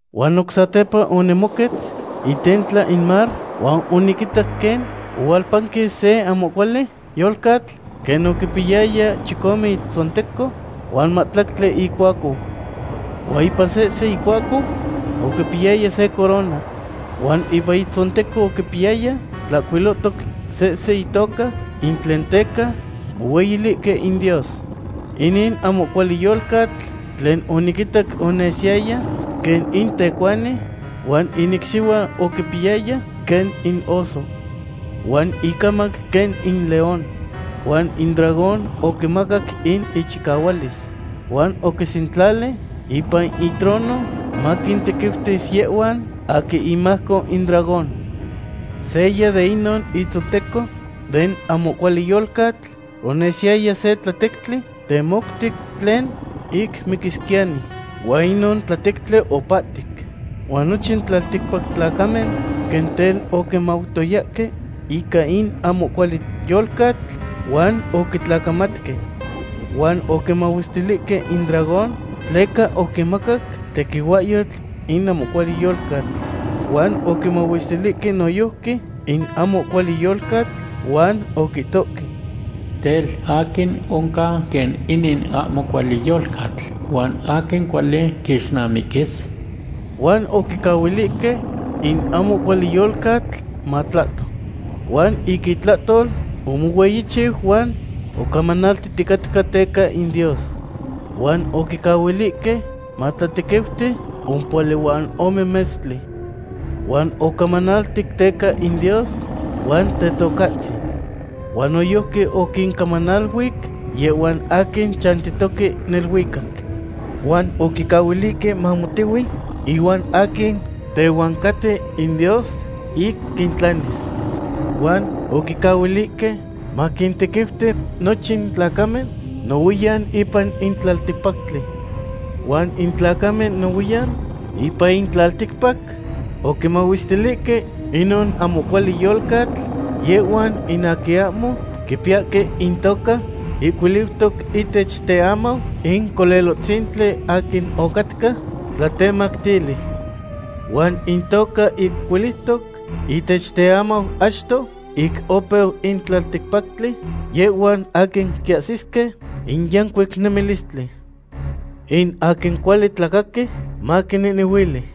Huan oc sepa onimoquetz itentla in mar huan oniquitac quen ohualpanquis se ahmo cuali yolcatl quen oquipiyaya chicome itzonteco huan mahtlactli icuacou. Huan ipan sehsen icuacou oquipiyaya se corona. Huan ipan intzonteco oquipiyaya tlahcuilotoc sehse intoca ic tlen teca mohueyilihque in Dios. Inin ahmo cuali yolcatl tlen oniquitac onesiyaya quen in tecuani huan in icxihuan oquimpiyaya quen in oso. Huan in icamac quen in león. Huan in dragón oquimacac in ichicahualis. Huan oquisentlali ipan itrono maquintequiutis yehhuan aquin imajco in dragón. Seya de inon itzonteco den ahmo cuali yolcatl onesiyaya se tlatectli temoutic tlen ic miquisquiyani. Huan inon tlatectli opahtic. Huan nochin tlalticpac tlacamen quen tel oquimautoyahque ica in ahmo cuali yolcatl huan oquitlacamatque. Huan oquimahuestilihque in dragón tleca oquimacac tequihuahyotl in ahmo cuali yolcatl. Huan oquimahuestilihque noyojqui in ahmo cuali yolcatl huan oquihtohque: ―Tel, ¿aquin oncan quen inin ahmo cuali yolcatl, huan aquin cuali quixnamiquis? Huan oquicahuilihque in ahmo cuali yolcatl matlahto. Huan ica itlahtol omohueyichiu huan ocamanaltihticatca teca in Dios. Huan oquicahuilihque matlatequiuti ompohuali huan ome metztli. Huan ocamanaltic teca in Dios huan Tetocahtzin. Huan noyojqui oquincamaniluic yehhuan aquin chantihtoque neluicac. Huan oquicahuilihque mamotehui inuan aquin tehuan caten in Dios ic quintlanis. Huan oquicahuilihque maquintequiuti nochin tlacamen nohuiyan ipan in tlalticpactli. Huan in tlacamen nohuiyan ipan in tlalticpac oquimahuestilihque inon ahmo cuali yolcatl, yehhuan in aquin ahmo quipiyahque intoca ihcuiliutoc ihtech teamau in Colelohtzintli aquin ocatca tlatemactili. Huan intoca ihcuiliutoc ihtech teamau achto ic opeu in tlalticpactli yehhuan aquin quiahsisque in yancuic nemilistli. In aquin cuali tlacaqui, maquinehnehuili.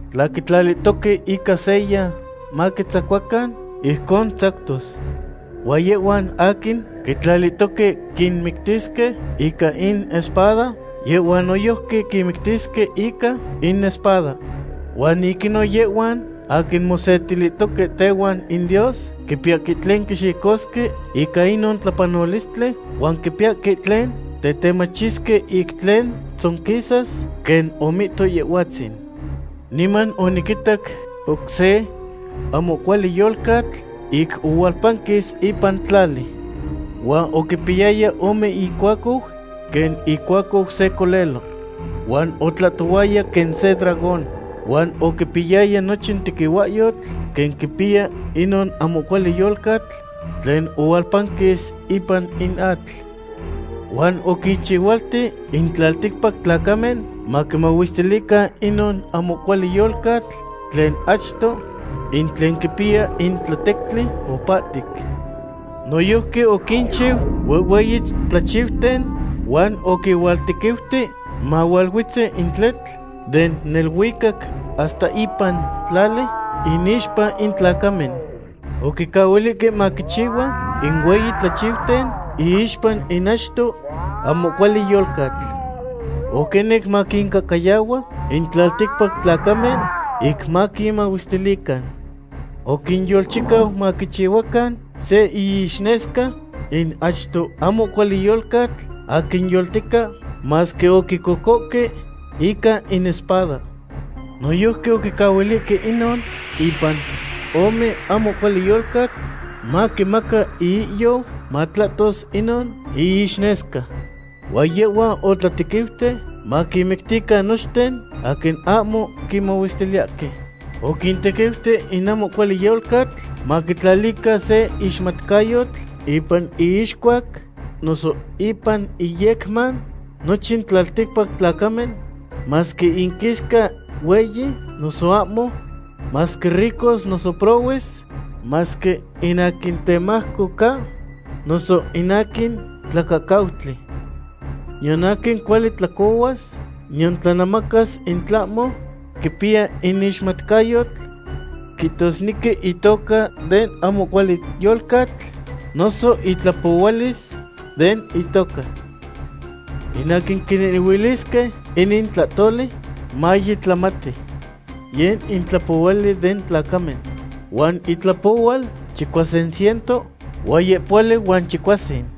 Tla quitlalihtoque ica seya maquitzacuacan, ijcon tzactos. Huan yehhuan aquin quitlalihtoque quinmictisque ica in espada, yehhuan noyojqui quinmictisque ica in espada. Huan ic inon yehhuan aquin mosetilihtoque tehuan in Dios quipiyahque tlen quixicosque ica inon tlapanolistli huan quipiyahque tlen tetemachisque ic tlen tzonquisas quen omihto Yehhuatzin. Niman oniquitac oc se ahmo cuali yolcatl ic ohualpanquis ipan tlali. Huan oquipiyaya ome icuacou quen icuacou se colelo. Huan otlahtohuaya quen se dragón. Huan oquipiyaya nochin tequihuahyotl quen quipiya inon ahmo cuali yolcatl tlen ohualpanquis ipan in atl. Huan oquinchihualti in tlalticpac tlacamen maquimahuestilican inon ahmo cuali yolcatl tlen achto, in tlen quipiya in tlatectli opahtic. Noyojqui oquinchiu huehhueyi tlachiuten huan oquihualtequiuti mahualuetzi in tletl den neluicac hasta ipan tlali, inixpa in tlacamen. Oquicahuilihque maquichihua in hueyi tlachiuten iixpa in achto ahmo cuali yolcatl. Oquinec maquincahcayahua in tlalticpac tlacamen ic maquinmahuestilican. Oquinyolchicau maquichihuacan se iixnesca in achto ahmo cuali yolcatl aquin yoltica, masque oquicocohque ica in espada. Noyojqui oquicahuilihque inon ipan ome ahmo cuali yolcatl maquimaca iihyou matlahtos inon iixnesca. Huan yehhua otlatequiuti maquinmictican nochten aquin ahmo quimahuestiliyahque. Oquintequiuti in ahmo cuali yolcatl maquitlalican se ixmatcayotl ipan iixcuac noso ipan iyecman nochin tlalticpac tlacamen, masque inquisca hueyi noso ahmo, masque ricos noso prohues, masque in aquin temajco ca noso in aquin tlacahcautli. Niyan aquin cuali tlacohuas niyan tlanemacas in tlahmo quipiya in ixmatcayotl, quihtosnequi itoca den ahmo cuali yolcatl, noso itlapohualis den itoca. In aquin quinehnehuilisnequi inin tlahtoli, maye tlamati. Yeh in tlapohuali den tlacamen. Huan itlapohual chicuasin ciento huan yehpohuali huan chicuasin.